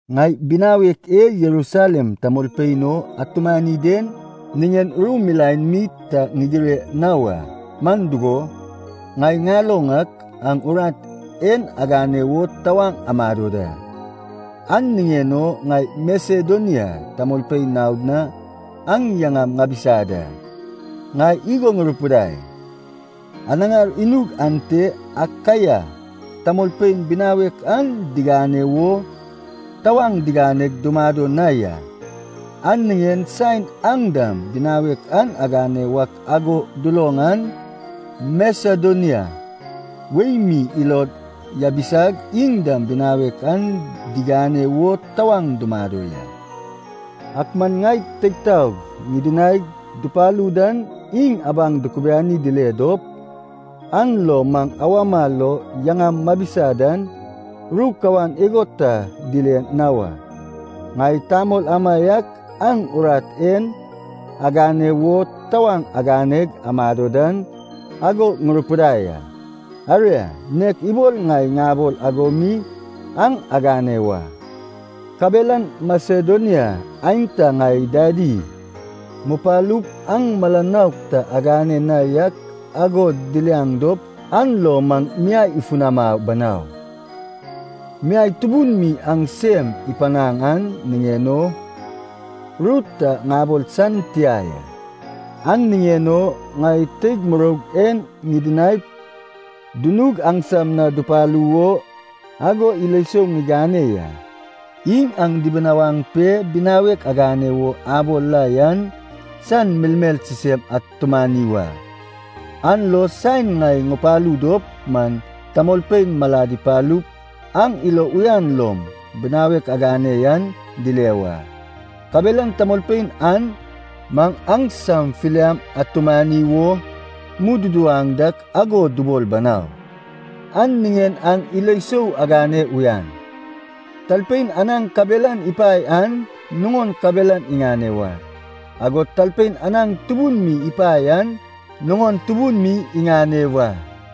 Ŋai binawek e Jerusalem tamolpein o atumani den niŋen ru milaen mi ta ŋigire na wa. Man dugo, ŋai ŋaloŋ ak aŋ urat en agane wo tawaŋ amado da. An niŋen o ŋai Masedonia tamolpein naod na aŋ yaŋam ŋabisa da. Ŋai igo ŋurupidai, “Anaŋar inug ante Akaia tamolpein binawek an digane wo tawaŋ diganeg dumado na ya.” An niŋen saen aŋ dam binawek an agane wak ago duloŋ an, Masedonia wei mi ilod yabisag iŋ dam binawek an digane wo tawaŋ dumado ya. Ak man ŋai teig taog ŋidinaig dupalu dan iŋ abaŋ dukubiani dile dop, an lo maŋ awama lo yaŋam mabisa dan ru kawan igo ta dile na wa. Ŋai tamol amaiak aŋ urat en agane wo tawaŋ aganeg amado dan ago ŋurupidai a. Aria, nek ibol ŋai ŋabol ago mi aŋ agane wa. Kabelan Masedonia aenta ŋai dadi mupalup aŋ mala nouk ta agane na yak ago diliaŋ dop, an lo maŋ miai ifunama banau. Miai tubun mi aŋ sem ipanaŋ an niŋen o, ru ta ŋabol san tia ya. An niŋen o ŋai teig muroug en ŋidinaip dunug aŋsam na dupalu wo ago ilo sou ŋigane ya. Iŋ aŋ dibinawaŋ pe binawek agane wo abol la yan, san melmel sisem atumani wa. An lo saen ŋai ŋupalu dop man tamolpein malad ipalup aŋ ilo uyan lom binawek agane yan dile wa. Kabelan tamolpein an maŋ aŋsam filiam atumani wo mududuwaŋ dak ago dubol banau. An niŋen aŋ ilo isou agane uyan. Talpein anaŋ kabelan ipae an nuŋon kabelan iŋane wa, agod talpein anaŋ tubun mi ipae an nuŋon tubun mi iŋane wa.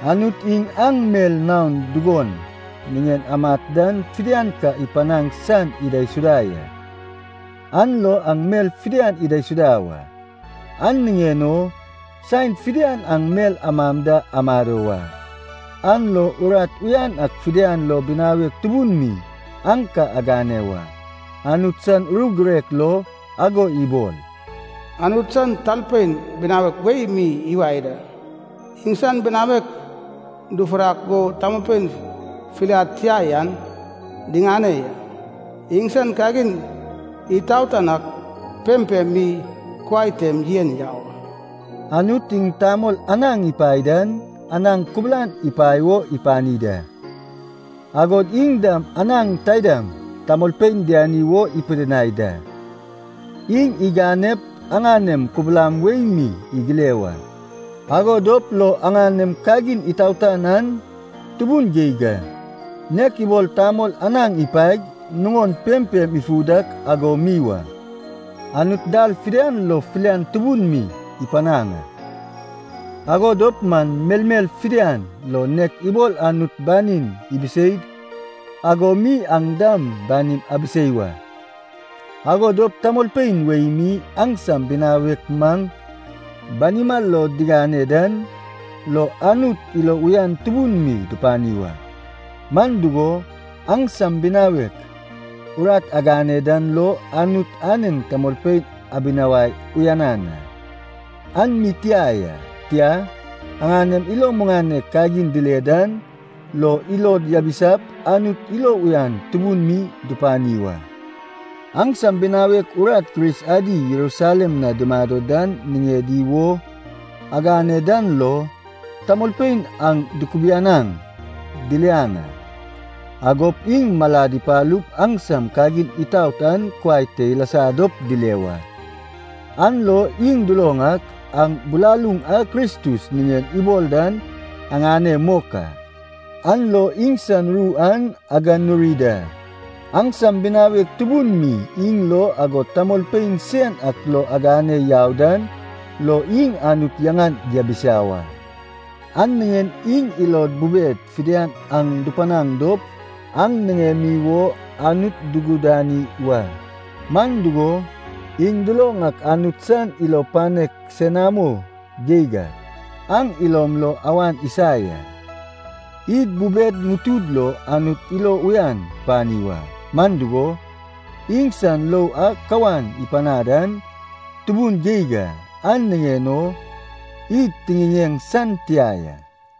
Anut iŋ aŋ mel naon dugon niŋen amat dan fidian ka ipanaŋ san idaisuda ya, an lo aŋ mel fidian idaisuda wa. An niŋen o saen fidian aŋ mel amam da amado wa, an lo urat uyan ak fidian lo binawek tubun mi aŋ ka agane wa. Anut san ru girek lo ago ibol, “Anut san talpein binawek wei mi iwae da, iŋsan binawek dufurak go tamolpein filiad tia yan diŋane ya; iŋsan kagin itaotan ak pempem mi kuai tem yen yau a.” Anut iŋ tamol anaŋ ipae dan anaŋ kubulan ipae wo ipani da, agod iŋ dam anaŋ taidam tamolpein diani wo ipidinai da. Iŋ iganep aŋanem kubulam wei mi igile wa. Ago dop lo aŋanem kagin itaotan an tubun geig a, nek ibol tamol anaŋ ipaeg nuŋon pempem ifu dak ago mi wa. Anut dal fidian lo filian tubun mi ipanaŋ a, ago dop man melmel fidian lo nek ibol Anut banin ibiseid ago mi aŋ dam banim abisei wa. Ago dop tamolpein wei mi aŋsam binawek maŋ banima lo diŋane dan lo Anut ilo uyan tubun mi dupani wa. Man dugo, aŋsam binawek urat agane dan lo Anut anen tamolpein abinawai uyanan a. An mi tia ya, tia, aŋanem ilo muŋanek kagin dile dan lo ilod yabisap Anut ilo uyan tubun mi dupani wa. Aŋsam binawek urat Kris adi Jerusalem na dumado dan niŋedi wo agane dan lo, tamolpein aŋ dukubianaŋ diliaŋ a, agop iŋ malad ipalup aŋsam kagin itaot an kuai te ilasa dop dile wa. An lo iŋ duloŋ ak aŋ bilaluŋ a Kristus niŋen ibol dan aŋane mok a, an lo iŋsan ru an aganuri da. Aŋsam binawek tubun mi iŋ lo agod tamolpein sen ak lo agane yau dan lo iŋ Anut yaŋan diabisa wa. An niŋen iŋ ilod bubed fidian aŋ dupanaŋ dop aŋ niŋemi wo Anut dugudani wa. Man dugo, iŋ duloŋ ak Anut san ilo panek senamo geig ak aŋ ilom lo awan isa ya. Id bubed ŋutud lo Anut ilo uyan tupani wa, man dugo, iŋsan lou a kawan ipanad an tubun geig a, an niŋen o id tiŋiŋeŋ san tia ya.